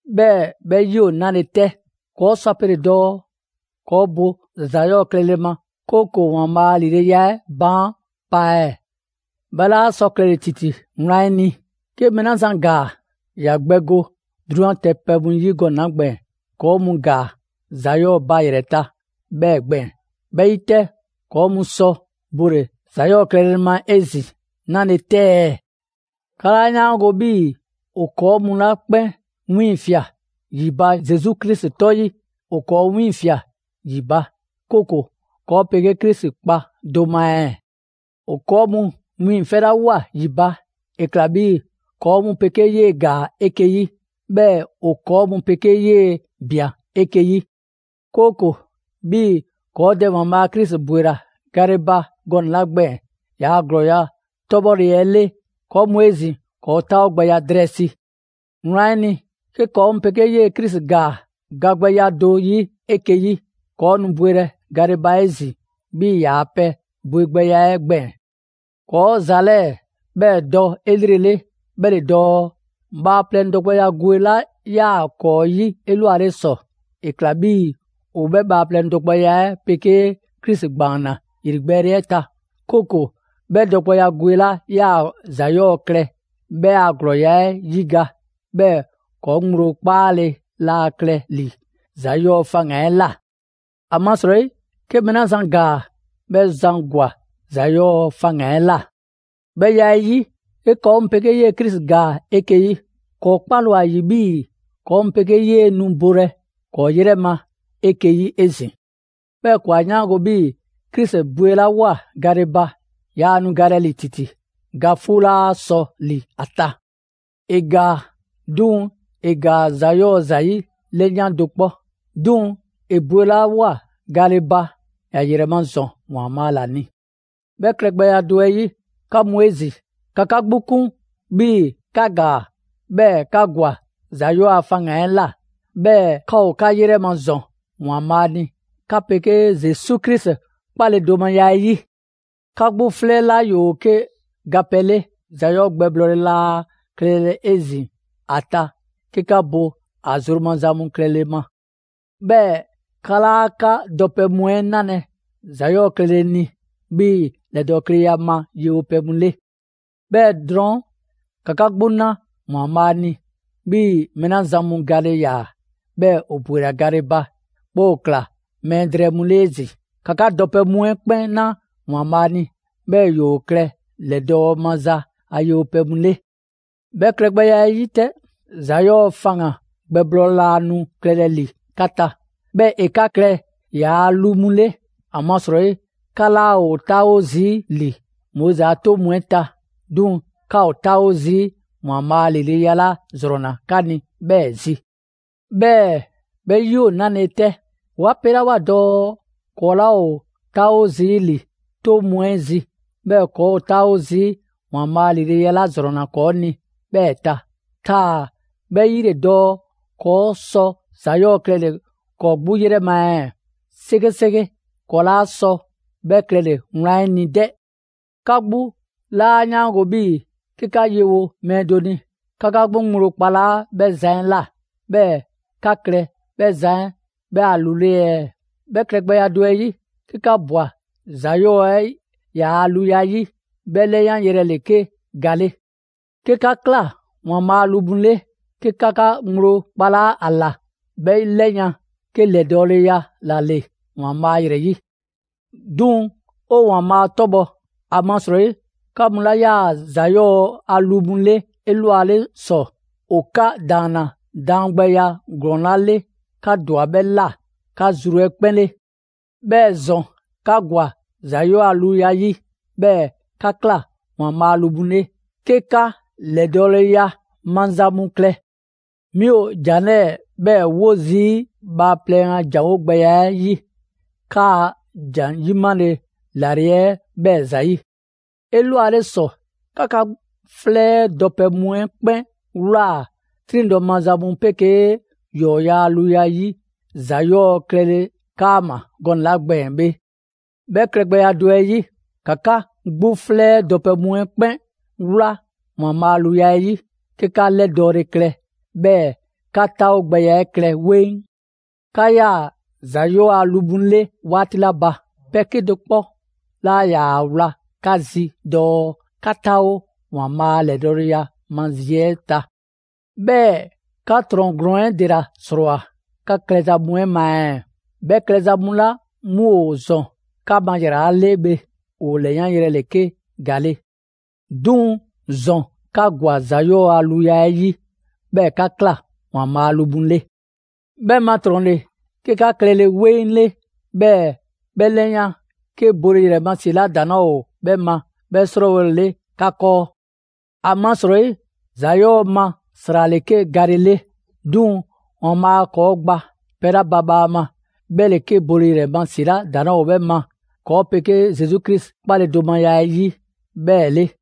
'Bhɛɛ‑ 'bhɛ 'yi ‑o 'nale‑ 'tɛ? ‑Kɔɔ' sɔ ‑a pele‑ dɔɔ ‑kɔɔ' bo ‑za 'yɔɔ‑ klɛle ma, 'kooko‑ ‑Waanbhaa' a ‑lileya 'ɛ baan' pa ɛɛ? 'Bhɛ 'laa sɔ klɛle‑ ‑titi wlan 'ɛ ni! 'Ke mɛɛ 'la zan ‑gaa, ‑ya gbɛ go 'drunyan ta pɛ mu 'yi gɔnɛ‑ 'la gbɛɛn‑, ‑kɔɔ' mu ‑gaa ‑za 'yɔɔ‑ ba ‑yrɛ ta 'bhɛɛ‑ gbɛɛn‑. 'Bhɛ 'yi 'tɛ ‑kɔɔ' mu sɔ bole‑ ‑za 'yɔɔ‑ klɛle ma 'ezin‑ 'nale‑ 'tɛ ɛɛ? 'Ka 'laa 'yaango‑ 'bhii‑ ‑o ‑kɔɔ' mu 'la 'kpɛn 'wiiŋfia꞊ ‑yi ba Zesu Krisi 'tɔ 'yi, ‑o ‑kɔɔ' 'wiiŋfia꞊ ‑yi ba, 'kooko‑ ‑kɔɔ' 'pegee Krisi kpa do ma ɛɛ? ‑O ‑kɔɔ' mu wiiŋfɛlawoa ‑yi ba, ‑e ꞊kla 'bhii‑ ‑kɔɔ' mu 'pegee 'yee‑ ‑gaa 'eke‑ 'yi, 'bhɛɛ‑ ‑o ‑kɔɔ' mu 'pegee 'yee‑ ꞊bian 'eke‑ yi; 'kooko‑ 'bhii‑ ‑kɔɔ' Dɛ ‑Waanbhaa' Krisi ‑bwela gale ba gɔnɛ‑ 'la gbɛɛn‑ ‑yaa' ‑glɔɔya' 'tɔbhɔle 'ɛ 'le, ‑kɔɔ' mu 'ezin‑ ‑kɔɔ' 'taawogbɛya drɛɛ si. Wlan 'ɛ ni, 'ke ‑kɔɔ' mu 'pegee 'yee‑ Krisi ‑gaa gagbɛya do 'yi 'eke‑ yi, ‑kɔɔ' nu bwelɛ gale ba 'ezin‑ 'bhii‑ ‑yaa' pɛ bwegbɛya 'ɛ gbɛɛn‑. ‑Kɔɔ' ‑za 'lɛɛ‑ 'bhɛ dɔ 'elrele, 'bhɛ ‑le dɔɔ: bhaaplɛŋ dɔgbɛya gwe 'la 'yaa‑ ‑kɔɔ' 'yi 'elwale ‑sɔ, ‑e ꞊kla 'bhii‑ ‑o 'bhɛ bhaaplɛŋ dɔgbɛya 'ɛ 'pegee Krisi ‑gbaanna ‑yrigbɛɛle 'ɛ ta; 'kooko‑ 'bhɛ dɔgbɛya gwe 'la 'yaa‑ ‑za 'yɔɔ‑ klɛ, 'bhɛ a ‑glɔɔya' 'ɛ 'yiga‑, 'bhɛɛ‑ ‑kɔɔ' ŋgblo 'kpaale‑ laa klɛ ‑li ‑za 'yɔɔ‑ faŋgan‑ 'ɛ ꞊la. ‑Amasrɔyi 'ke mɛɛ 'la zan ‑gaa, 'bhɛ zan ‑gwa ‑za 'yɔɔ‑ faŋgan‑ 'ɛ ꞊la. 'Bhɛ ya 'ɛ 'yi, 'ke ‑kɔɔ' mu 'pegee Krisi ‑gaa 'eke‑ 'yi, ‑kɔɔ' 'kpale‑ ‑o ‑a ‑yi 'bhii‑ ‑kɔɔ' mu 'pegee 'yee‑ nu bolɛ ‑kɔɔ' 'yrɛ ma 'eke‑ 'yi 'ezin‑. 'Bhɛɛ‑ ‑kɔɔ' 'a 'yaango‑ 'bhii‑ Krisi bwelawoa gale ba, yaa nu galɛ ‑li ‑titi. Ga 'fuu 'laa sɔ ‑li ‑a ta. ‑E ‑gaa, 'duŋ‑ ‑e ‑gaa ‑za 'yɔɔ‑ ‑zayi' ‑lɛyan' do 'kpɔ. 'Duŋ‑ ‑e bwelawoa gale ba, ‑ya ‑yrɛ ma ‑zɔn ‑Waanbhaa' ‑la ni. 'Bhɛ klɛgbɛya do 'ɛ 'yi, 'ka mu 'ezin‑, ‑ka 'ka 'gbu 'kun 'bhii‑ 'ka ‑gaa, 'bhɛɛ‑ 'ka ‑gwa ‑za 'yɔɔ‑ a faŋgan‑ 'ɛ ꞊la; 'bhɛɛ‑ 'ka ‑o 'ka 'yrɛ ma ‑zɔn ‑Waanbhaa' ni 'ka 'pegee Zesu Krisi 'kpaledomaya 'ɛ 'yi. 'Ka 'gbu 'flɛ 'la ‑yoo 'ke gapɛ 'le, ‑za 'yɔɔ‑ gbɛblɔɔle laa klɛlɛ 'ezin‑ ‑a ta 'ke 'ka bo ‑a zru maza mu klɛle ma. 'Bhɛɛ‑ 'ka 'laa 'ka dɔpɛ mu 'ɛ 'nalɛ‑ ‑za 'yɔɔ‑ klɛle ni 'bhii‑ ‑lɛdɔɔkleya ma yewo pɛ mu 'le. 'Bhɛɛ‑ drɔɔn', ‑ka 'ka 'gbu 'na ‑Waanbhaa' ni 'bhii‑ mɛɛ 'la zan mu gale ‑yaa, 'bhɛɛ‑ ‑o ‑bwela gale ba, 'bhɛɛ‑ ‑o ꞊kla mɛɛ drɛɛ mu 'le 'ezin‑. ‑Ka 'ka dɔpɛ mu 'ɛ 'kpɛn 'na ‑Waanbhaa' ni, 'bhɛɛ‑ ‑yoo klɛ ‑lɛdɔɔ maza a yewo pɛ mu 'le. 'Bhɛ klɛgbɛya 'ɛ 'yi 'tɛ, ‑za 'yɔɔ‑ faŋgan‑ gbɛblɔɔle laa nu klɛlɛ ‑li 'ka ta, 'bhɛɛ‑ ‑e 'ka klɛ ‑yaa' lu mu 'le; ‑amasrɔyi 'ka 'laa ‑o 'taawo zii' ‑li Moizi a 'toŋ mu 'ɛ ta, 'duŋ‑ 'ka ‑o 'taawo zii' ‑Waanbhaa' ‑lileya 'la ‑zrɔnna 'ka ni 'bhɛɛ‑ zi. 'Bhɛɛ‑ 'bhɛ 'yi ‑o 'nale‑ 'tɛ? 'Wa 'pelawoa dɔɔ ‑kɔɔ' 'laa ‑o 'taawo zii' ‑li 'toŋ mu 'ɛ zi, 'bhɛɛ‑ ‑kɔɔ' ‑o 'taawo zii' ‑Waanbhaa' ‑lileya 'la ‑zrɔnna ‑kɔɔ' ni 'bhɛɛ‑ ꞊ta, taa‑ 'bhɛ 'yi ‑le dɔɔ ‑kɔɔ' sɔ ‑za 'yɔɔ‑ klɛle‑ ‑kɔɔ' 'gbu 'yrɛ ma ɛɛ? 'Sekeseke, ‑kɔɔ' 'laa sɔ 'bhɛ klɛle‑ wlan 'ɛ ni 'dɛ! 'Ka 'gbu 'laa 'yaango‑ 'bhii‑ 'ke 'ka yewo mɛɛ do ni, 'ka 'ka ŋgblo kpalaa' 'bhɛ zan 'ɛ ꞊la, 'bhɛɛ‑ 'ka klɛ 'bhɛ zan 'ɛ 'bhɛ a lu 'le ɛɛ? 'Bhɛ klɛgbɛya do 'ɛ 'yi, 'ke 'ka ꞊bwa ‑za 'yɔɔ‑ 'ɛ ‑yaa' luya 'yi, 'bhɛ 'lɛyanyrɛ ‑le 'ke ga 'le. 'Ke 'ka ꞊kla ‑Waanbhaa' a lu mu 'le, 'ke 'ka 'ka ŋgblo kpalaa' ‑a ꞊la, 'bhɛ 'lɛyan‑ 'ke ‑lɛdɔɔleya ‑la ‑le ‑Waanbhaa' ‑yrɛ 'yi. 'Duŋ‑ 'o ‑Waanbhaa' 'tɔbhɔ‑, ‑amasrɔyi 'ka 'mu 'la 'yaa‑ ‑za 'yɔɔ‑ a lu mu 'le 'elwale ‑sɔ, ‑o 'ka ‑daanna daangbɛya ‑glɔɔn 'la 'le, 'ka ‑dwa 'bhɛ ꞊la 'ka zru 'ɛ 'kpɛn 'le. 'Bhɛɛ‑ ‑zɔn 'ka ‑gwa ‑za 'yɔɔ‑ a luya 'ɛ 'yi, 'bhɛɛ‑ 'ka ꞊kla ‑Waanbhaa' a lu mu 'le, 'ke 'ka ‑lɛdɔɔleya maza mu klɛ. 'Mi ‑o ‑jan 'lɛɛ‑ 'bhɛɛ‑ 'wo zii' bhaaplɛŋ a ‑janwo' gbɛya 'ɛ 'yi, 'kaa‑ ‑jan 'yimale ‑lale' 'ɛ 'bhɛɛ‑ ‑zayi'. 'Elwale ‑sɔ 'ka 'ka 'flɛ 'ɛ dɔpɛ mu 'ɛ 'kpɛn ꞊wlaa 'triŋdɔ‑ maza mu 'pegee ‑yɔɔya' a luya 'yi ‑za 'yɔɔ‑ klɛle 'kaama‑ gɔnɛ‑ 'la gbɛɛn‑ bhe; 'bhɛ klɛgbɛya do 'ɛ 'yi, ‑ka 'ka 'gbu 'flɛ 'ɛ dɔpɛ mu 'ɛ 'kpɛn 'wla ‑Waanbhaa' a luya 'ɛ 'yi, 'ke 'ka 'lɛdɔɔle klɛ, 'bhɛɛ‑ 'ka 'taawogbɛya 'ɛ klɛ 'weŋ. 'Ka 'yaa‑ ‑za 'yɔɔ‑ a lu mu 'le 'waati 'la ba, pɛ 'kedo‑ 'kpɔ 'laa ‑yaa ‑a wla 'ka zi dɔɔ 'ka 'taawo ‑Waanbhaa' a ‑lɛdɔɔleya ma zi 'ɛ ta. 'Bhɛɛ‑ 'ka ‑trɔn ‑glɔɔn 'ɛ ‑dela ‑srɔɔwoa꞊ 'ka klɛza mu 'ɛ ma ɛɛ? 'Bhɛ klɛza mu 'la 'mu ‑o ‑zɔn 'ka ma ‑yrala' 'le bhe. ‑O ‑lɛyanyrɛ ‑le 'ke ga 'le. 'Duŋ‑ ‑zɔn 'ka ‑gwa ‑za 'yɔɔ‑ a luya 'ɛ 'yi, 'bhɛɛ‑ 'ka ꞊kla ‑Waanbhaa' a lu mu 'le. 'Bhɛ ma ‑trɔn ‑le 'ke 'ka klɛle 'weŋ 'le, 'bhɛɛ‑ 'bhɛ 'lɛyan 'ke bole ‑yrɛ ma ‑si 'la ‑daŋ' 'laa ‑o 'bhɛ ma 'bhɛ 'srɔɔwole 'le 'ka 'kɔɔ. ‑Amasrɔyi ‑za 'yɔɔ‑ ma ‑sra ‑le 'ke gale 'le; 'duŋ‑ ‑Waanbhaa' ‑kɔɔ' gba pɛ 'la ba bhaama, 'bhɛ ‑le 'ke bole ‑yrɛ ma ‑si 'la ‑daŋ' 'laa ‑o 'bhɛ ma ‑kɔɔ' 'pegee Mɛɛzan Zesu Krisi 'kpaledomaya 'ɛ 'yi 'bhɛɛ‑ 'le.